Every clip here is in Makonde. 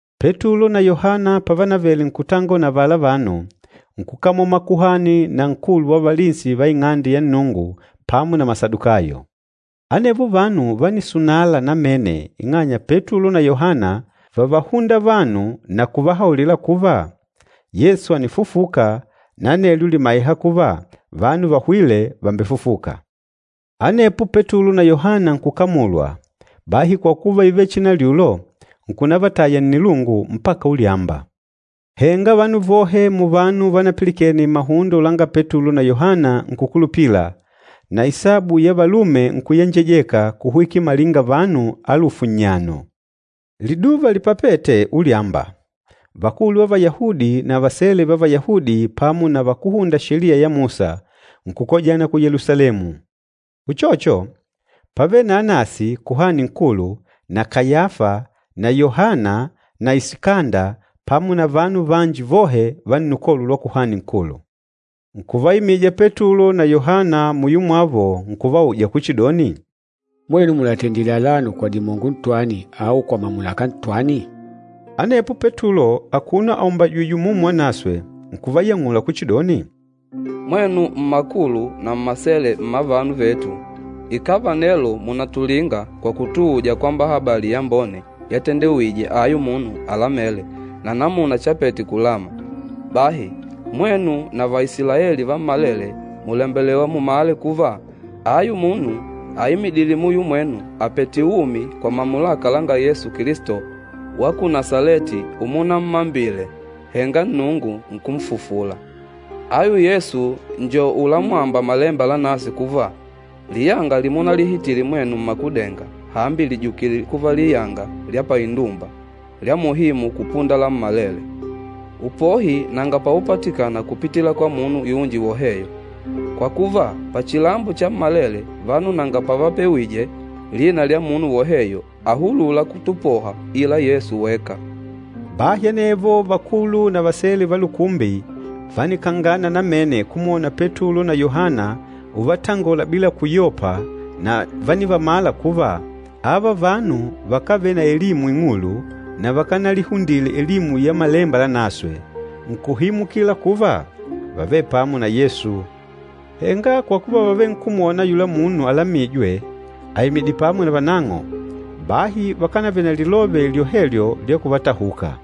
Petulo na Yohana pavanavele nkutangola na avala vanu, nkukamola makuhani na nkulu wa valinsi va Ing'ande ya Nnungu pamo na Masadukayo. Anevo vanu vánisunala namene ing'anya Petulo na Yohana vávahunda vanu na kuvahaulila kuva, Yesu ànifufuka na anelyo lìmaiha kuva vanu vahwîle vàmbefufuka. Anepo Petulo na Yohana nkukamulwa, bahi kwa kuva ívele chinalyulo, nkunavataya nnilungu mpaka ulyamba. Henga vanu vohe muvanu vanapilikene mahundo langa Petulo na Yohana nkukulupila, na isabu ya valume nkuyenjejeka kuhwikila malinga vanu alufu nnyano. Liduva lipapête ulyamba, vakulu va Vayahudi na vasele va Vayahudi pamo na vakúhunda Sheliya ya Musa, nkukojana ku Yelusalemu. Uchocho, pávele na Anasi Kuhani Nkulu na Kayafa na Yohana na Isikanda pamo na vanu vanji vohe va nnukolo lwa Kuhani Nkulu. Nkuvaimija Petulo na Yohana muyo mwavo nkuvauja kuchidoni, “Mwenu mùlatendile alano kwa dimongo ntwani au kwa mamulaka ntwani?” Anepo Petulo akuno aumbajìjwè Umumu Wanaswe nkuvayang'ula kuchidoni, “Mwenu mmakulu na mmasele mma vanu vetu, ikàva nelo mùnatulinga kwa kutuuja kwamba habali yambone yatendewije ayu munu alamêle na namuna chapete kulama, bahi, mwenu na Vaisilaeli vammalele mùlembelewa mumale kuva, ayu munu aimidîle muyo mwenu àpete umi kwa mamulaka langa Yesu Kilisto wa ku Nasaleti umunammambile, henga Nnungu nkunfufula. Ayu Yesu njo ulamwamba Malemba Lanaswe kuva, ‘Liyanga limunahitile mwenu mmakudenga, hambi lìjukile kuva liyanga lya paindumba, lya muhimu kupunda lammalele.’ Upohi nanga paupatikana kupitila kwa munu yunji woheyo. Kwa kuva, pachilambo chammalele vanu nanga pavapewije lina lya munu woheyo ahulûla kutupoha, ila Yesu weka.” Bahi anevo vakulu na vasele va lukumbi vánikangana namene kumwona Petulo na Yohana uvatangola bila kuyopa na vánivamala kuva, ava vanu vakávele na elimu ing'ulu na vakanalihundile elimu ya Malemba Lanaswe. Nkuhimukila kuva vávele pamo na Yesu. Henga kwa kuva vávenkumwona ayula munu alamîjwe aimidìlè pamo na vanang'o, bahi vakanavele na lilove lyohelyo lya kuvatahuka.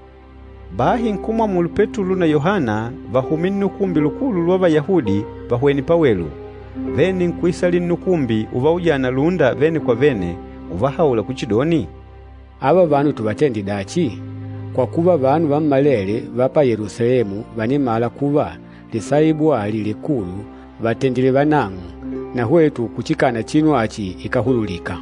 Bahi nkumwamulu Petulo na Yohana vahume Nnukumbi Lukulu lwa Vayahudi vahwene pawelu, vene nkuisalila nnukumbi uvaujana lúnda vene kwa vene, uvahaula kuchidoni, “Ava vanu tuvatende dachi? Kwa kuva, vanu vammalele va pa Yelusalemu vànimala kuva, lisaibu ali likulu vàtendile vanang'o, na hwetu kuchikana chinu achi ikáhululika.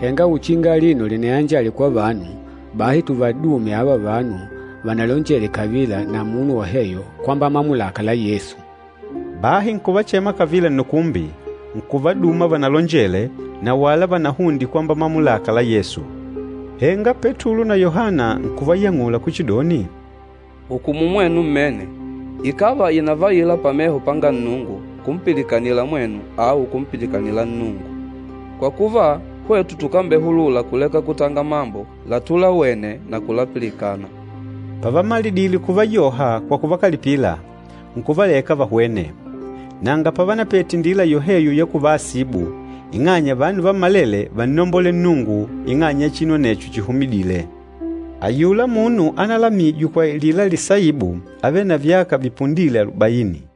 Henga uchinga alino linayanjale kwa vanu, bahi tuvadume ava vanu vanalonjele kavila na munu woheyo kwamba mamulaka la Yesu.” Bahi nkuvachema kavila nnukumbi, nkuvaduma vanalonjele, na wala vanahunde kwamba mamulaka la Yesu. Henga Petulo na Yohana nkuvayang'ula kuchidoni, “Hukumu mwenu mmene ikàva ìnavaila pameho panga Nnungu kumpilikanila mwenu au kumpilikanila Nnungu. Kwa kuva, hwetu tukambehulula kuleka kutanga mambo latulawene na kulapilikana.” Pavamalidile kuvayoha kwa kuvakalipila, nkuvaleka vahwene. Nanga pavanapete indila yoheyo ya kuvaasibu, ing'anya vanu vammalele vánnombolela Nnungu ing'anya ya chinu anecho chihumidîle. Ayula munu analamijwe kwa alila lisaibu ávele na vyaka vipundîle alubaini.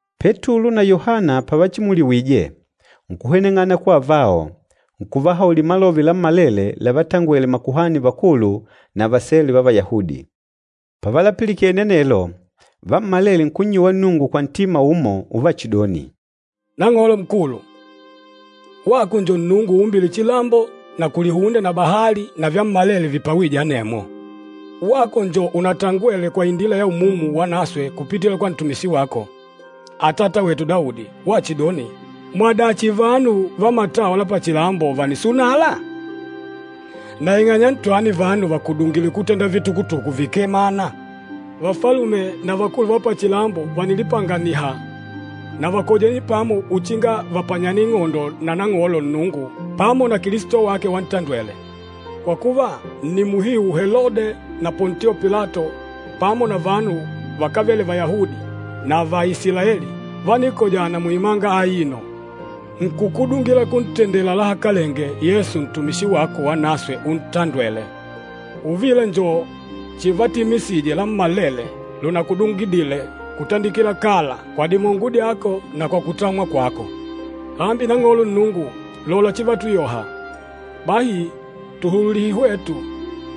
Petulo na Yohana pavachimuliwije, nkuhweneng'ana kwa avao, nkuvahaulila malove lammalele lavatangwele makuhani vakulu na vasele va Vayahudi. Pavalapilikene anelo, vammalele nkunnyuwa Nnungu kwa ntima umo uvachidoni, “Nang'olo Nkulu, wako njo Nnungu uumbîle chilambo na kulihunde na bahali na vyammalele vipawîje anemwo. Wako njo unatangwele kwa indila ya Umumu Wanaswe kupitila kwa ntumishi wako, atata wetu Daudi, wachidoni, ‘Mwadachi vanu vamatawa la pachilambo vànisunala? Na ing'anya ntwani vanu vakudungidile kutenda vitukutuku vikee mana? Vafalume na vakulu va pachilambo vànilipanganiha na vakojene pamo uchinga vapanyane ing'ondo na Nang'olo Nnungu pamo na Kilisto wake wantandwele.’ Kwa kuva, nni muhiu Helode na Pontio Pilato pamo na vanu vakávele Vayahudi na va Isilaeli vánikojana muimanga aino, nkukudungila kuntendela lahakalenge Yesu ntumishi wako wanaswe untandwele. Uvila njo chivatimisije lammalele lunakudungidile kutandikila kala kwa dimongo dyako na kwa kutamwa kwako. Hambi Nang'olo Nnungu, lola chivatuyoha. Bahi tuhululihe hwetu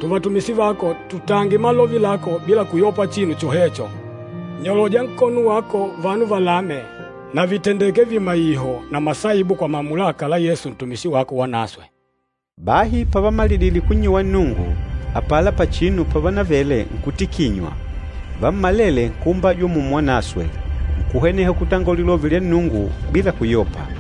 tuvatumishi vako tutange malove lako bila kuyopa chinu chohecho. Nyoloja nkono wako vanu valame na vitendeke vimaiho na masaibu kwa mamulaka la Yesu ntumishi wako wanaswe.” Bahi pavamalidile kunnyuwa Nnungu, apala pachinu pavanavele nkutikinywa. Vammalele nkuumbajwa Umumu Wanaswe, nkuhweneha kutanga lilove lya Nnungu bila kuyopa.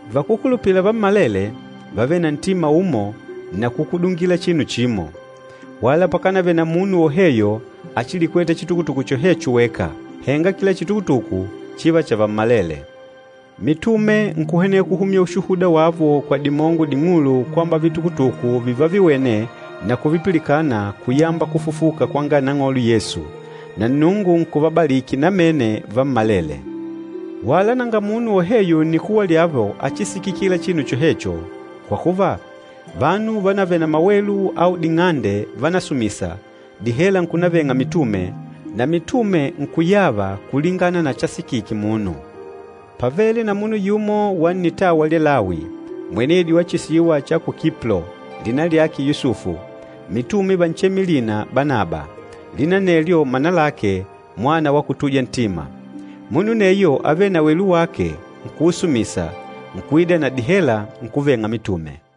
Vakúkulupila vammalele vávele na ntima umo na kukudungila chinu chimo. Wala pakanavele na munu woheyo achilikweta chitukutuku chohecho weka, henga kila chitukutuku chíva chavammalele. Mitume nkuhweneha kuhumya ushuhuda wavo kwa dimongo ding'ulu kwamba vitukutuku vivaviwene na kuvipilikana kuyamba kufufuka kwanga Nang'olo Yesu, na Nnungu nkuvabaliki namene vammalele. Wala nanga munu woheyo nnikuwa lyavo achisikikila chinu chohecho, kwa kuva, vanu vanavele na mawelu au ding'ande vánasumisa, dihela nkunaveng'a mitume, na mitume nkuyava kulingana na chasikike munu. Pávele na munu yumo wa nnitawa lya Lawi, mwenedi wa chisiwa cha ku Kiplo, lina lyake Yusufu, mitume vanchemile lina Banaba, lina anelyo mana lake, “Mwana wa kutuja ntima.” Munu aneyo ávele na welu wake nkuusumisa, nkuida na dihela, nkuveng'a mitume.